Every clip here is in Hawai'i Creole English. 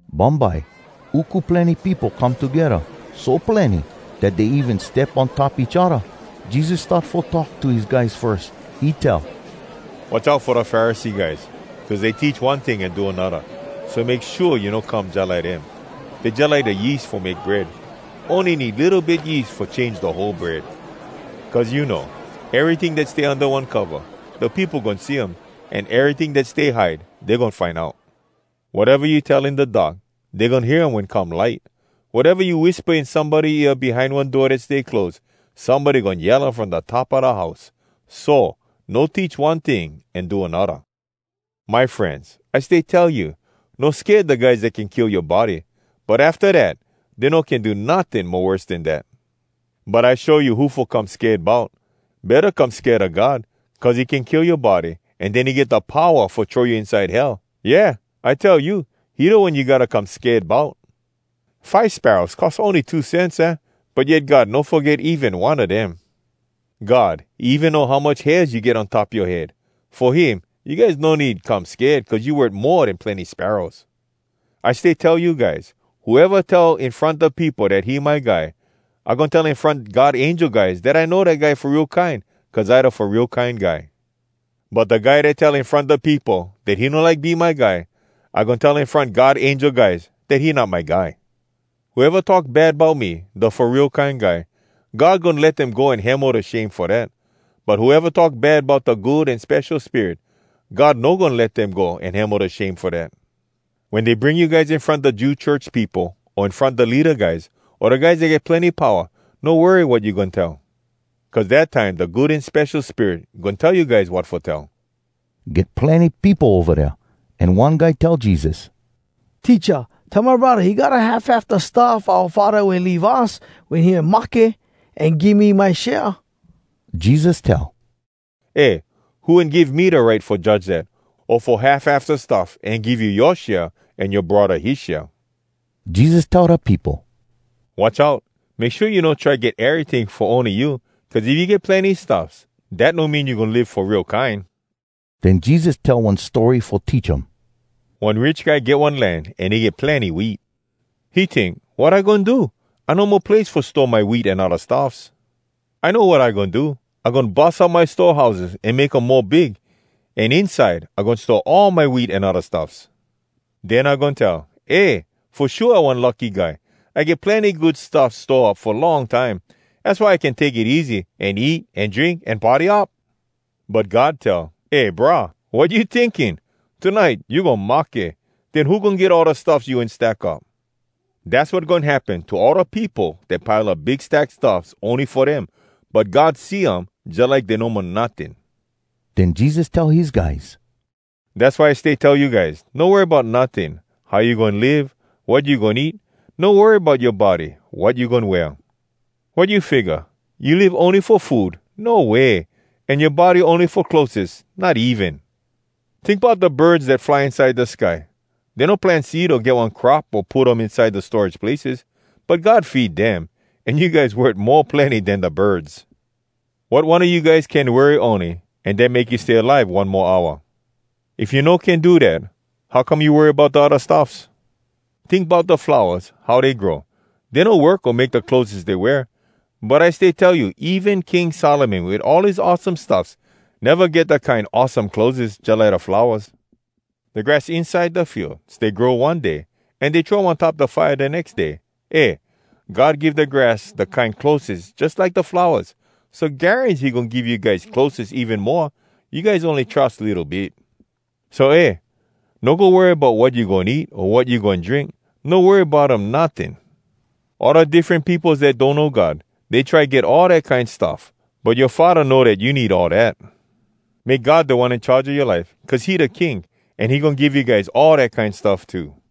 Bumbye uku plenny peopo come togedda, so plenny dat dey even step on top each odda. Jesus start fo talk to his guys firs. He tell, “Watch out fo da Pharisee guys, cuz dey teach one ting an do anodda. So make shua you no come jalike dem. Dey jalike da yeast fo make bread—ony need litto bit yeast fo change da whole bread. Cuz you know, eryting dat stay unda one cova, da peopo goin see um, an eryting dat stay hide, dey goin find out. Wateva you tell in da dark, dey goin hear um wen come light. Wateva you wispa in somebody ear behind one door dat stay close, somebody goin yell um from da top a da house. So, no teach one ting an do anodda.” “My frenz, I stay tell you, no sked da guys dat can kill yoa body, but afta dat, dey no can do notting mo worse den dat. But I show you who fo come sked bout—betta come sked a God, cuz he can kill yoa body an den he get da powa fo throw you inside Hell. Yeah, I tell you, he da One you gotta come sked bout! Five sparrows cost ony two cents, aah? But yet God no foget even one a dem. God, he even know how much hairs you get on top yoa head. Fo him, you guys no need come sked, cuz you worth mo den plenny sparrows. “I stay tell you guys, whoeva tell in front da peopo dat he my guy, I goin tell in front God angel guys dat I know dat guy fo real kine, cuz I da Fo Real Kine Guy. But da guy dat tell in front da peopo dat he no like be my guy, I goin tell in front God angel guys dat he not my guy. “Whoeva talk bad bout me, da Fo Real Kine Guy, God goin let dem go an hemo da shame fo dat. But whoeva talk bad bout da Good An Spesho Spirit, God no goin let dem go an hemo da shame fo dat. “Wen dey bring you guys in front da Jew church peopo, o in front da leada guys, o da guys dat get plenny powa, no worry wat you goin tell. Cuz dat time da Good An Spesho Spirit goin tell you guys wat fo tell.” Get plenny peopo ova dea, an one guy tell Jesus, “Teacha, tell my braddah he gotta half half da stuff oua faddah wen leave us wen he mahke, an give me my share.” Jesus tell, “Eh, who wen give me da right fo judge dat, o fo half half da stuff an give you yoa share an yoa braddah his share?” Jesus tell da peopo, “Watch out! Make shua you no try get eryting fo ony you, cuz if you get plenny stuffs, dat no mean you goin live fo real kine!” Den Jesus tell one story fo teach um: “One rich guy get one land, an he get plenny wheat. He tink, ‘Wat I goin do? I no mo place fo store my wheat an odda stuffs. I know wat I goin do! I goin bus up my store houses an make um mo big, an inside I goin store all my wheat an odda stuffs. Den I goin tell, “Eh, fo shua I one lucky guy! I get plenny good stuffs store up fo long time. Az why I can take it easy, an eat an drink an party up!” ’ But God tell, ‘Eh brah! Wat you tinking! Tonite you goin mahke! Den who goin get all da stuffs you wen stack up?’ “Dass wat goin happen to all da peopo dat pile up big stack stuffs ony fo dem, but God see um jalike dey no mo notting.” Den Jesus tell his guys, “Dass why I stay tell you guys, no worry bout notting, how you goin live, wat you goin eat. No worry bout yoa body, wat you goin wear. Wat you figga? You live ony fo food? No way! An yoa body ony fo clotheses? Not even! Tink bout da birds dat fly inside da sky. Dey no plant seed o get one crop o put um inside da storage places, but God feed dem. An you guys worth mo plenny den da birds! Wat one a you guys can worry ony, an dat make you stay alive one mo hour? If you no can do dat, how come you worry bout da odda stuffs? Tink bout da flowas, how dey grow. Dey no work o make da clotheses dey wear. But I stay tell you, even King Solomon, wit all his awesome stuffs, neva get da kine awesome clotheses jalike da flowas. Da grass inside da field stay grow one day, an dey throw um on top da fire da nex day. Eh, God give da grass da kine clotheses jalike da flowas, so garans he goin give you guys clotheses even moa. You guys ony trus litto bit! So eh! No go worry bout wat you goin eat, o wat you goin drink. No worry bout um notting. All da diffren peopos dat donno God, dey try get all dat kine stuff. But yoa Faddah know dat you need all dat. Make God Da One In Charge a yoa life, cuz he da King, an he goin give you guys all dat kine stuff too.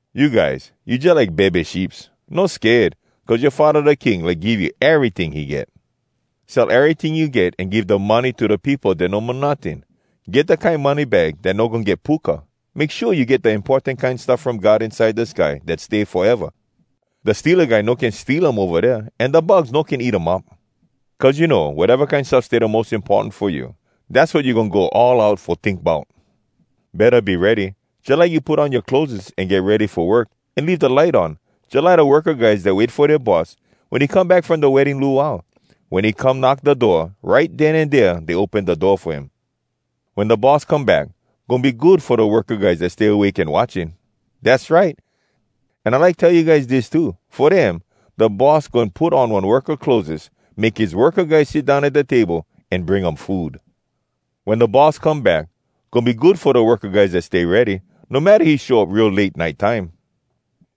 “You guys, you jalike bebe sheeps. No sked, cuz yoa Faddah da King like give you eryting he get. Sell eryting you get an give da money to da peopo dat no mo notting. Get da kine money bag dat no goin get puka. Make shua you get da importan kine stuff from God inside da sky, dat stay foeva. Da steala guy no can steal um ova dea, an da bugs no can eat um up. Cuz you know, wateva kine stuffs stay da mos importan fo you, dass wat you goin go all out fo tink bout. “Betta be ready, jalike you put on yoa clotheses an get ready fo work, an leave da light on, jalike da worka guys dat wait fo dea boss, wen he come back from da wedding luau. Wen he come knock da door, right den an dea dey open da door fo him. Wen da boss come back, goin be good fo da worka guys dat stay awake an watching. Dass right! An I like tell you guys dis too: Fo dem, da boss goin put on one worka clotheses, make his worka guys sit down at da table, an bring um food. Wen da boss come back, goin be good fo da worka guys dat stay ready, no matta he show up real late nite time.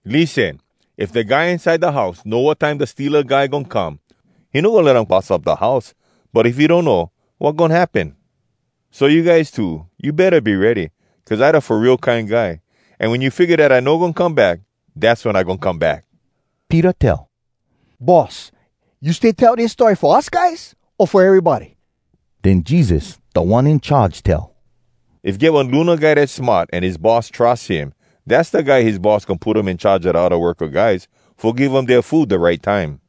Lissen! If da guy inside da house know wat time da steala guy goin come, he no goin let um bus up da house. But if he donno, wat goin happen? So you guys too, you betta be ready, cuz I da Fo Real Kine Guy, an wen you figga dat I no goin come back, dass wen I goin come back!” Peter tell, “Boss, you stay tell dis story fo us guys o fo erybody?” Den Jesus Da One In Charge tell, “If get one luna guy dat smart an his boss trus him, dass da guy his boss goin put um in charge a da odda worka guys, fo give um dea food da right time.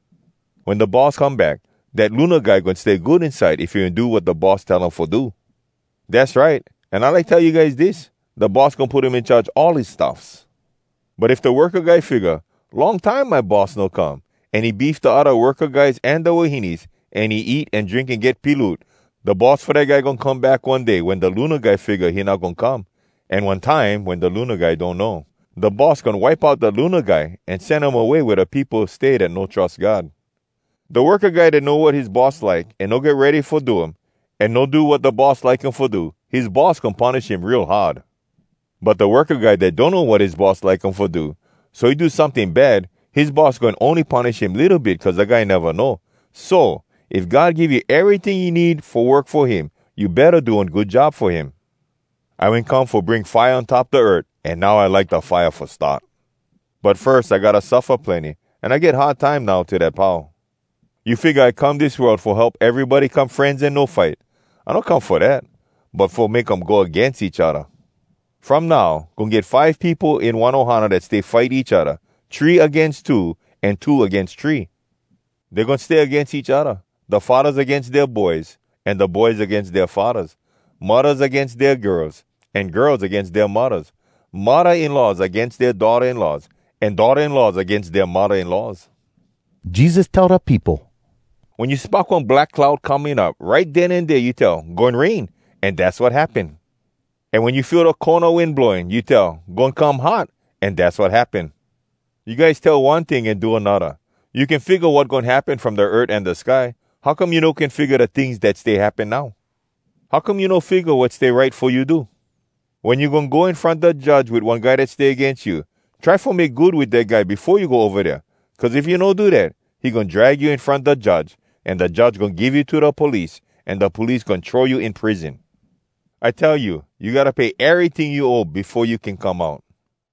Wen da boss come back, dat luna guy goin stay good inside if he wen do wat da boss tell him fo do. Dass right! An I like tell you guys dis: Da boss goin put him in charge all his stuffs. But if da worka guy figga, ‘Long time my boss no come,’ an he beef da odda worka guys an da wahines, an he eat an drink an get piloot, da boss fo dat guy goin come back one day wen da luna guy figga he not goin come, an one time wen da luna guy donno. Da boss goin wipe out da luna guy an sen um away wea da peopo stay dat no trus God. “Da worka guy dat know wat his boss like, an no get ready fo do um, an no do wat da boss like him fo do, his boss goin punish him real hard. But da worka guy dat donno wat his boss like um fo do, so he do someting bad, his boss goin ony punish him litto bit cuz da guy neva know. So, if God give you eryting you need fo work fo him, you betta do one good job fo him. “I wen come fo bring fire on top da earth, an now I like da fire fo start. But firs I gotta suffa plenny, an I get hard time now till dat pau. You figga I come dis world fo help erybody come frenz an no fight? I no come fo dat, but fo make um go agains each odda. From now, goin get five peopo in one ohana dat stay fight each odda, three agains two, an two agains three. Dey goin stay agains each odda, da faddahs agains dea boys, an da boys agains dea faddahs, muddahs agains dea girls, an girls agains dea muddahs, muddah-in-laws agains dea daughtah-in-laws, an daughtah-in-laws agains dea muddah-in-laws.” Jesus tell da peopo, “Wen you spock one black cloud coming up, right den an dea you tell, ‘Goin rain,’ an dass wat happen. An wen you feel da kona wind blowing, you tell, ‘Goin come hot,’ an dass wat happen. You guys tell one ting an do anodda! You can figga wat goin happen from da earth an da sky. How come you no can figga da tings dat stay happen now?” “How come you no figga wat stay right fo you do? Wen you goin go in front da judge wit one guy dat stay agains you, try fo make good wit dat guy befo you go ova dea. Cuz if you no do dat, he goin drag you in front da judge, an da judge goin give you to da police, an da police goin throw you in prison. I tell you, you gotta pay eryting you owe befo you can come out.”